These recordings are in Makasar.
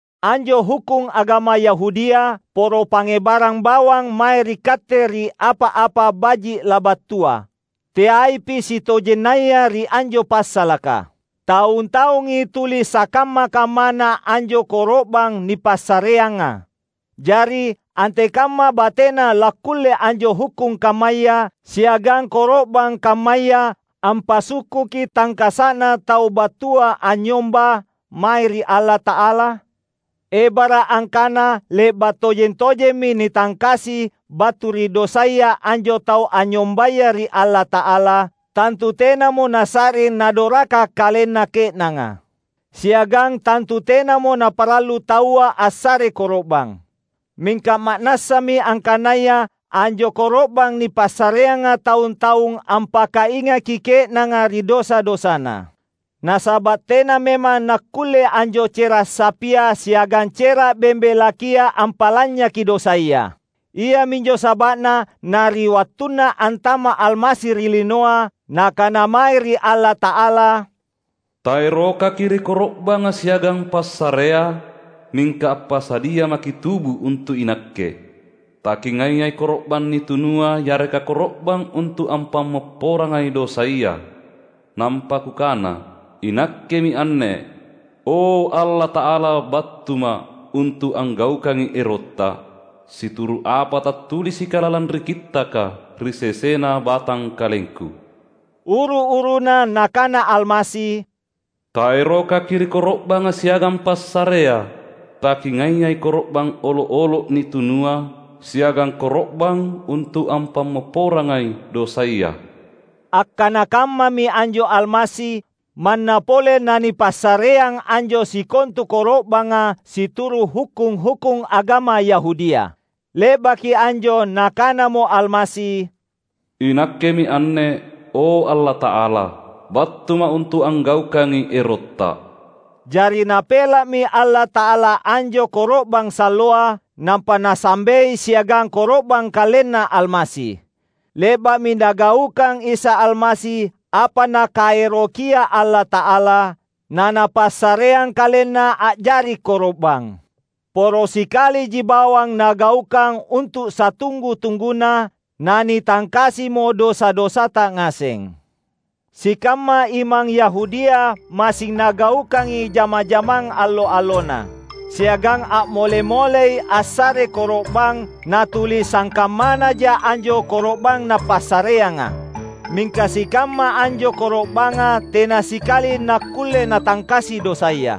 Anjo hukkung agama Yahudia, poro pangngebarang bawang mae ri katte ri apa-apa baji’ labattua; teaipi sitojennaya ri anjo passalaka. Taung-taungi tuli sakamma-kammana anjo koro’bang nipassareanga. Jari, antekamma batena lakkulle anjo hukkung kammaya siagang koro’bang kammaya ampasukkuki tangkasa’na tau battua anynyomba mae ri Allata’ala? Ebara’ angkana le’ba’ tojeng-tojemmi nitangkasi battu ri dosaya anjo tau anynyombaya ri Allata’ala, tantu tenamo nasa’ring nadoraka kalenna ke’nanga. Siagang tantu tenamo naparallu taua assare koro’bang. Mingka ma’nassami angkanaya anjo koro’bang nipassareanga taung-taung ampakaingaki ke’nanga ri dosa-dosana. Nasaba’ tena memang nakkulle anjo cera’ sapia siagang cera’ bembe lakia ampa’lanynyaki dosaya. Iaminjo saba’na na ri wattunna antama’ Almasi ri linoa, Nakana mae ri Allata’ala, "TaerokaKi’ ri koro’banga siagang passarea; mingka appasadia maKi’ tubu untu’ iNakke. TaKingaiai koro’bang nitunua yareka koro’bang untu’ ampammopporangai dosaya. Nampa Kukana, ‘INakkemi anne, O, Allata’ala BattuMa’ untu’ anggaukangi erotTa, situru’ apa tattulisika lalang ri Kittaka ri sesena BatangkalengKu.’" Uru-uruna Nakana Almasi, "TaerokaKi’ ri koro’banga siagang passarea; taKingaiai koro’bang olo’-olo’ nitunua siagang koro’bang untu’ ampammopporangai dosaya." Akkana kammami anjo Almasi, manna pole nanipassareang anjo sikontu koro’banga situru’ hukkung-hukkung agama Yahudia. Le’baki anjo Nakanamo Almasi, "INakkemi anne, o Allata’ala! BattuMa’ untu’ anggaukangi erotTa." Jari Napela’mi Allata’ala anjo koro’bang salloa, nampa Nasambei siagang koro’bang KalenNa Almasi. Le’ba’mi Nagaukang Isa Almasi apa Nakaerokia Allata’ala, na Napassareang KalenNa a’jari koro’bang. Poro sikaliji bawang Nagaukang untu’ satunggu-tungguna, na nitangkasimo dosa-dosata ngaseng. Sikamma imang Yahudia massing nagaukangi jama-jamang allo-allona; siagang a’mole-molei assare koro’bang natuli sangkammanaja anjo koro’bang napassareanga. Mingka sikamma anjo koro’banga tena sikali nakkulle natangkasi dosaya.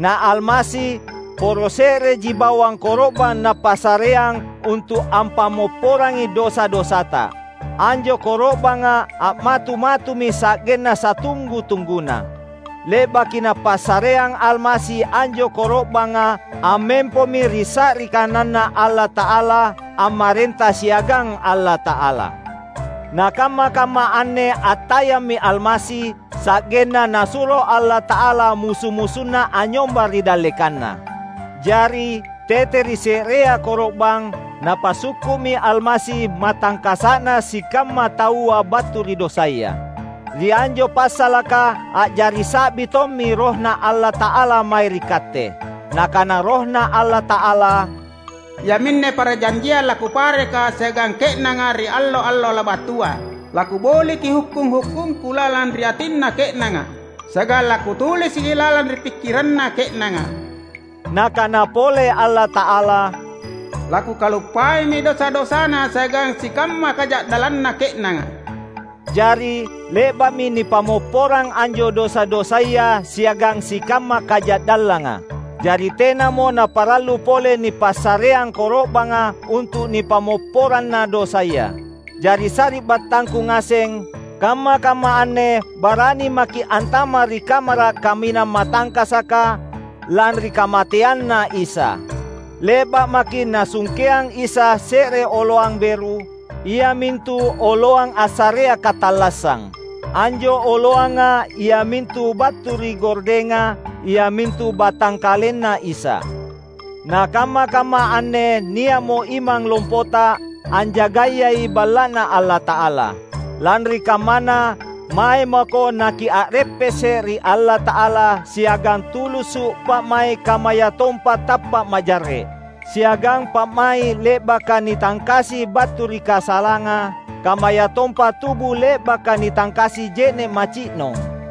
Na Almasi, poro se’reji bawang koro’bang Napassareang untu’ ampammopporangi dosa-dosata; anjo koro’banga a’matu-matumi sa’genna satunggu-tungguna. Le’baki Napassareang Almasi anjo koro’banga ammempomi ri sa’ri kananNa Allata’ala, ammarenta siagang Allata’ala. Na kamma-kamma anne attayammi Almasi, sa’genna Nasuro Allata’ala musu-musunNa anynyomba ri dallekanNa. Jari, tete ri se’rea koro’bang, Napasukku’mi Almasi matangkasa’na sikamma taua battu ri dosaya. Ri anjo passalaka a’jari sa’bi tommi RohNa Allata’ala mae ri katte. Nakana RohNa Allata’ala, "‘Iaminne parjanjiang laKupareka siagang ke’nanga ri allo-allo labattua, laKuboliki hukkung-hukkungKu lalang ri atinna ke’nanga siagang laKutulisiki lalang ri pikkiranna ke’nanga.’" Nakana pole Allata’ala, "LaKukaluppaimi dosa-dosana siagang sikamma kaja’dallanna ke’nanga." Jari, le’ba’mi nipammopporang anjo dosa-dosaya siagang sikamma kaja’dallanga; jari tenamo naparallu pole nipassareang koro’banga untu’ nipammopporanna dosaya. Jari sari’battangku ngaseng, kamma-kamma anne barani maki’ antama’ ri Kamara’ Kaminang Matangkasaka, lanri kamateanNa Isa. Le’ba’ maki’ Nasungkeang Isa se’re oloang beru, iamintu oloang assarea katallassang. Anjo oloanga iamintu battu ri gordenga, iamintu BatangkalenNa Isa. Na kamma-kamma anne nia’mo imang lompota, anjagayai Balla’Na Allata’ala. Lanri kammana, mae mako nakia’reppese’ ri Allata’ala siagang tulusu’ pa’mai’ kammayatompa tappa’ majarre’; siagang pa’mai’ le’baka nitangkasi battu ri kasalanga, kammayatompa tubu le’baka nitangkasi je’ne’ maci’nong.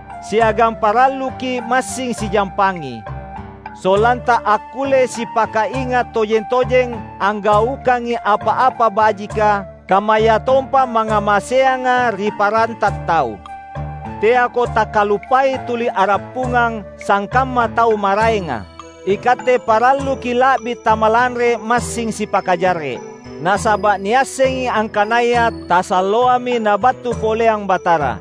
Siagang paralluki’ massing sijampangi; sollanta akkulle sipakainga’ tojeng-tojeng anggaukangi apa-apa bajika, kammayatompa mangngamaseanga ri paranta tau. Teako takkaluppai tuli a’rappungang, sangkamma tau maraenga. Ikatte paralluki’ la’bi tamalanre massing sipakajarre’; nasaba’ niassengi angkanaya tasalloami Nabattu poleang Batara.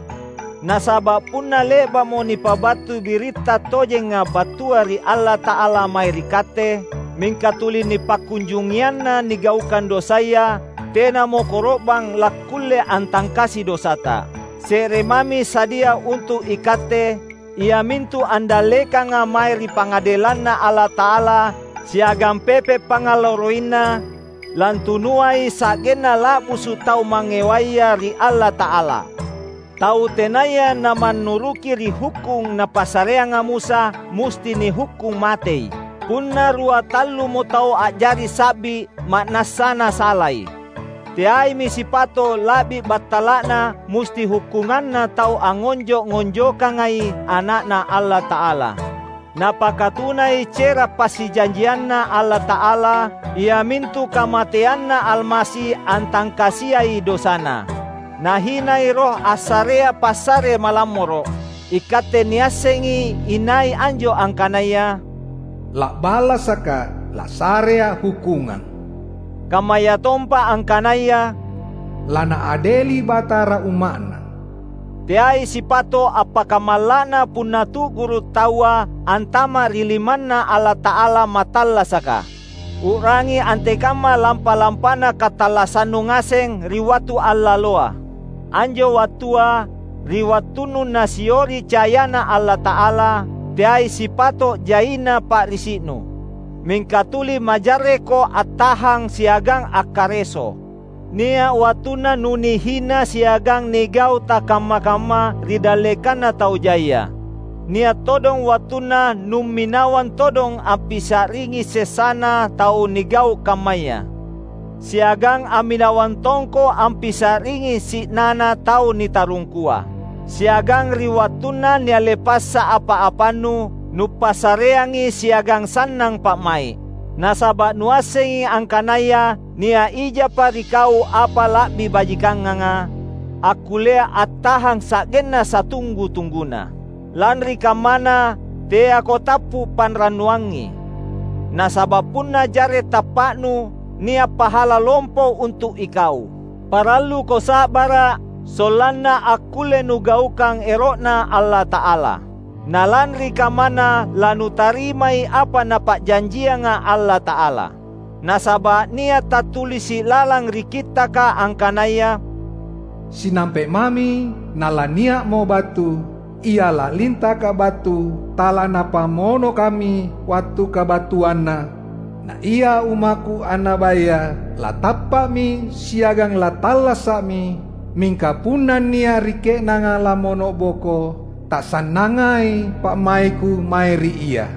Nasaba’ punna le’ba’mo nipabattu biritta tojenga battua ri Allata’ala mae ri katte, mingka tuli nipakkunjungianna nigaukang dosaya, tenamo koro’bang lakkulle antangkasi dosata. Se’re mami sadia untu’ ikatte, iamintu andallekanga mae ri pangadelanNa Allata’ala siagang pepe’ pangngalarroiNa, lantunuai sa’genna la’busu’ tau mangngewaya ri Allata’ala! Tau tenaya namannuruki ri hukkung napassareanga Musa musti nihukkung matei, punna rua tallumo tau a’jari sa’bi ma’nassana salai. Teaimi sipato’ la’bi battala’na musti hukkunganna tau angngonjo’-ngonjokangai Ana’Na Allata’ala. Napakatunai cera’ passijanjianNa Allata’ala, iamintu kamateanNa Almasi antangkasiai dosana. Nahinai Roh assarea passare malammoro’. Ikatte niassengi inai anjo angkanaya, "La’balasakA’! LassareA’ hukkungang!" kammayatompa angkanaya, "LaNaadeli Batara Umma’Na." Teai sipato’ appakamalla’na punna tu’guru’ taua antama’ ri limanNa Allata’ala Mattallasaka! U’rangi antekamma lampa-lampana katallassannu ngaseng ri wattu allaloa. Anjo wattua, ri wattunnu Nasiori cayaNa Allata’ala, teai sipato’ jaina pa’risi’nu; mingka tuli majarrekko attahang siagang akkareso. Nia’ wattunna nunihina siagang nigau’ takamma-kamma ri dallekanna tau jaia. Nia’ todong wattunna numminawang todong ampisa’ringi sessana tau nigau’ kammaya. Siagang amminawang tongko ampisa’ringi si’nana tau nitarungkua. Siagang ri wattunna nialle passa apa-apannu, nupassareangi siagang sannang pa’mai’. Nasaba’ nuassengi angkanaya nia’ ijapa ri kau apa la’bi bajikanganga, akkullea attahang sa’genna satunggu-tungguna. Lanri kammana, teako tappu’ panrannuangngi. Nasaba’ punna jarre’ tappa’nu, nia’ pahala lompo untu’ ikau! Paralluko sa’bara’, sollanna akkulle nugaukang ero’Na Allata’ala. Na lanri kammana lanutarimai apa Napa’janjianga Allata’ala. Nasaba’ nia’ tattulisi’ lalang ri Kittaka angkanaya, "Sinampe’ mami nalania’mo battu Ia lalintaka battu; talaNapamonokami wattu kabattuanNa. Na ia ummakKu annabaya latappa’mi siagang lattallasa’mi; mingka punna nia’ ri ke’nanga lammono’boko, tasannangai pa’maikKu mae ri ia."